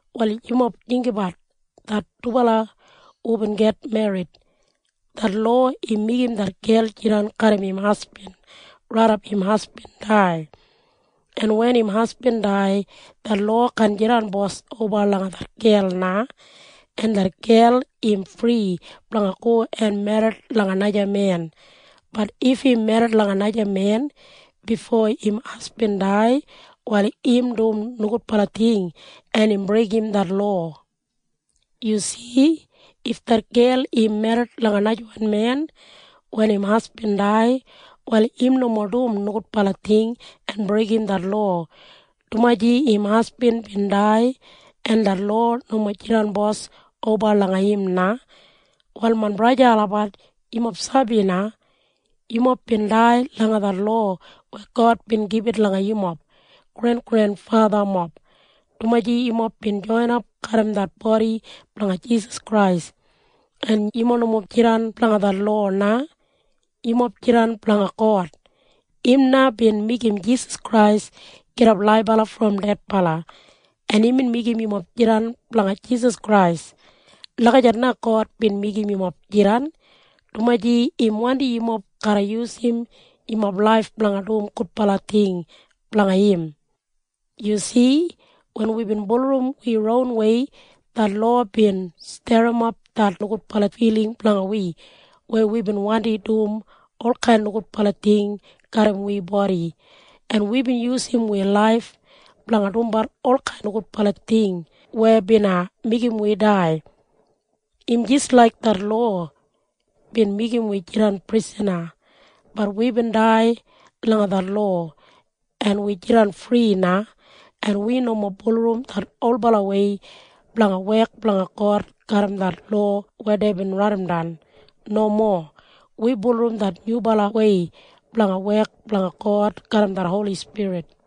Wal yumob jinggabat det dubala hubin git merrit. Det lowa im meigim det gel jidan garram im hasbin raidap im hasbin dai, en wen im hasbin dai, det lowa kaan jidan bos oba langa det gel na, en det gel im fri blanga go en merrit langa naja men. Bat if im merrit langa naja men bifo im hasbin dai, wal im dum nogudbala ting en im breigim det lowa. Yu si? If det gel im merrit langa najawan men wen im hasbin dai, wal im nomo dum nogudbala ting en breigim det lowa, dumaji im hasbin bin dai en det lowa nomo jidan bos oba langa im na. Wal main braja en sista olabat, yumob sabi na? Yumob bin dai langa det lowa weya God bin gibit langa yumob grengrenfathamob, dumaji yumob bin joinap garram det bodi blanga Jisas Krais. En yumob nomo jidan blanga det lowa na. Yumob jidan blanga God. Im na bin meigim Jisas Krais gidap laibala brom dedbala, en imbin meigim yumob jidan blanga Jisas Krais. Lagijat na God bin meigim yumob jidan, dumaji im wandi yumob garra yusum yumob laif blanga dum gudbala ting blanga im. Yu si? Wen wibin bulurrum wi ronwei, det lowa bin sterrimap det nogudbala filing blanga wi weya wibin wandi dum olkain nogudbala ting garram wi bodi, en wibin yusum wi laif blanga dumbat olkain nogudbala ting weya bina meigim wi dai. Im jis laik det lowa bin meigim wi jidan prisana. Bat wibin dai langa det lowa, en wi jidan fri na. En wi nomo bulurrum det olbalawei blanga wek blanga God garram det lowa weya deibin raidimdan. Nomo. Wi bulurrum det nyubalawei blanga wek blanga God garram det Holi Spirit.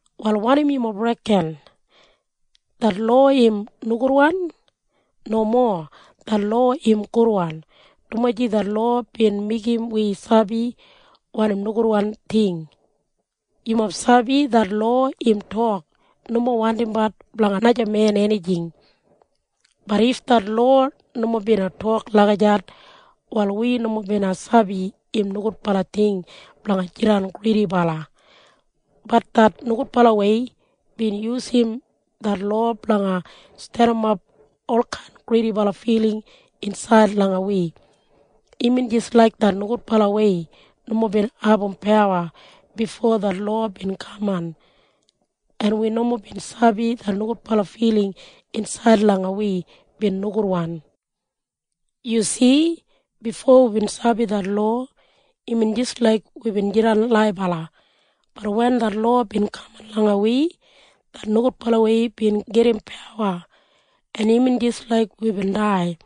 Wal wanim yumob reken? Det lowa im nogudwan? Nomo. Det lowa im gudwan, dumaji det lowa bin meigim wi sabi wanim nogudwan ting. Yumob sabi? Det lowa im tok, “Nomo wandimbat blanga najamen enijing.” Bat if det lowa nomo bina tok lagijat, wal wi nomo bina sabi im nogudbala ting blanga jidan gridibala. Bat det nogudbalawei bin yusum det lowa blanga sterrimap olkain gridibala filing insaid langa wi. Imbin jis laik det nogudbalawei nomo bin abum pawa bifo det lowa bin kaman, en wi nomo bin sabi det nogudbala filing insaid langa wi bin nogudwan. Yu si? Bifo wibin sabi det lowa, imbin jis laik wibin jidan laibala. Bat wen det lowa bin kaman langa wi, det nogudbalawei bin gedim pawa, en imbin jis laik wibin dai.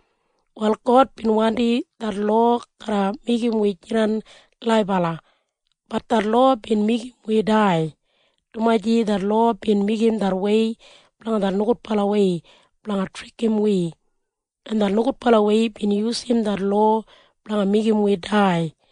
Wal God bin wandi det lowa garra meigim wi jidan laibala. Bat det lowa bin meigim wi dai, dumaji det lowa bin meigim det wei blanga det nogudbalawei blanga trikim wi, en det nogudbalawei bin yusum det lowa blanga meigim wi dai.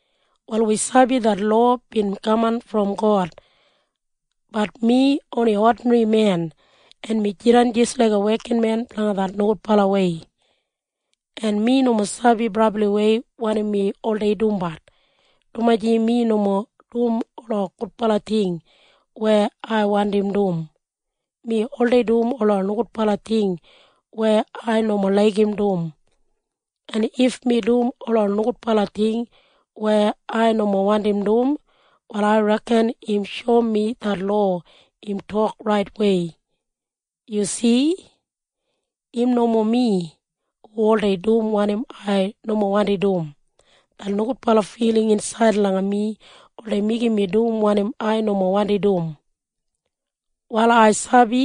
Wal wi sabi det lowa bin kaman brom God. Bat mi oni odinri men, en mi jidan jis laiga wekinmen blanga det nogudbalawei. En mi nomo sabi brabliwei wanim mi oldei dumbat, dumaji mi nomo dum ola gudbala ting weya ai wandim dum. Mi oldei dum ola nogudbala ting weya ai nomo laigim dum. En if mi dum ola nogudbala ting weya ai nomo wandim dum, wal ai reken im shoum mi det lowa im tok raitwei. Yu si? Im nomo mi hu oldei dum wanim ai nomo wandim dum. Det nogudbala filing insaid langa mi oldei meigim mi dum wanim ai nomo wandim dum. Wal ai sabi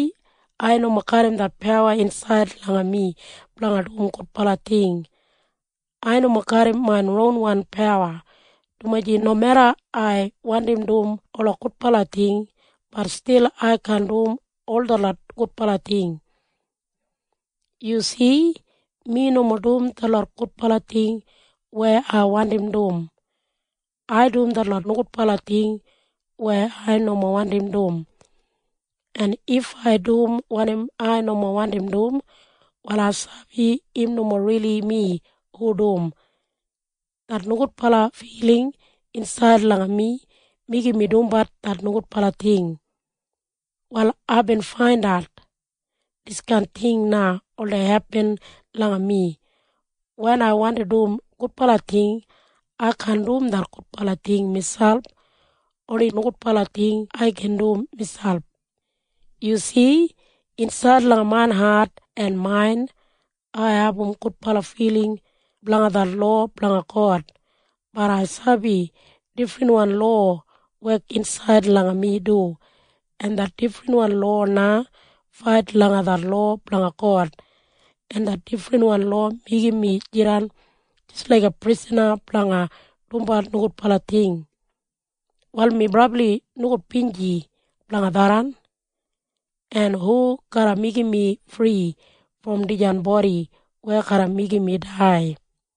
ai nomo garram det pawa insaid langa mi blanga dum gudbala ting. Ai nomo garram main ronwan pawa, dumaji nomeda ai wandim dum ola gudbala ting, bat stil ai kaan dum ol detlot gudbala ting. Yu si? Mi nomo dum detlot gudbala ting weya ai wandim dum. Ai dum detlot nogudbala ting weya ai nomo wandim dum. En if ai dum wanim ai nomo wandim dum, wal ai sabi im nomo rili mi hu dum. Det nogudbala filing insaid langa mi meigim mi dumbat det nogudbala ting. Wal aibin faindat diskain ting na oldei hepin langa mi. Wen ai wandim dum gudbala ting, ai kaan dum det gudbala ting miselp. Oni nogudbala ting ai gin dum miselp. Yu si? Insaid langa main hat en main, ai abum gudbala filing blanga det lowa blanga God. Bat ai sabi difrinwan lowa wek insaid langa mi du. En det difrinwan lowa na fait langa det lowa blanga God, en det difrinwan lowa meigim mi jidan jis laiga prisana blanga dumbat nogudbala ting. Wal mi brabli nogudbinji blanga tharran. En hu garra meigim mi fri brom dijan bodi weya garra meigim mi dai?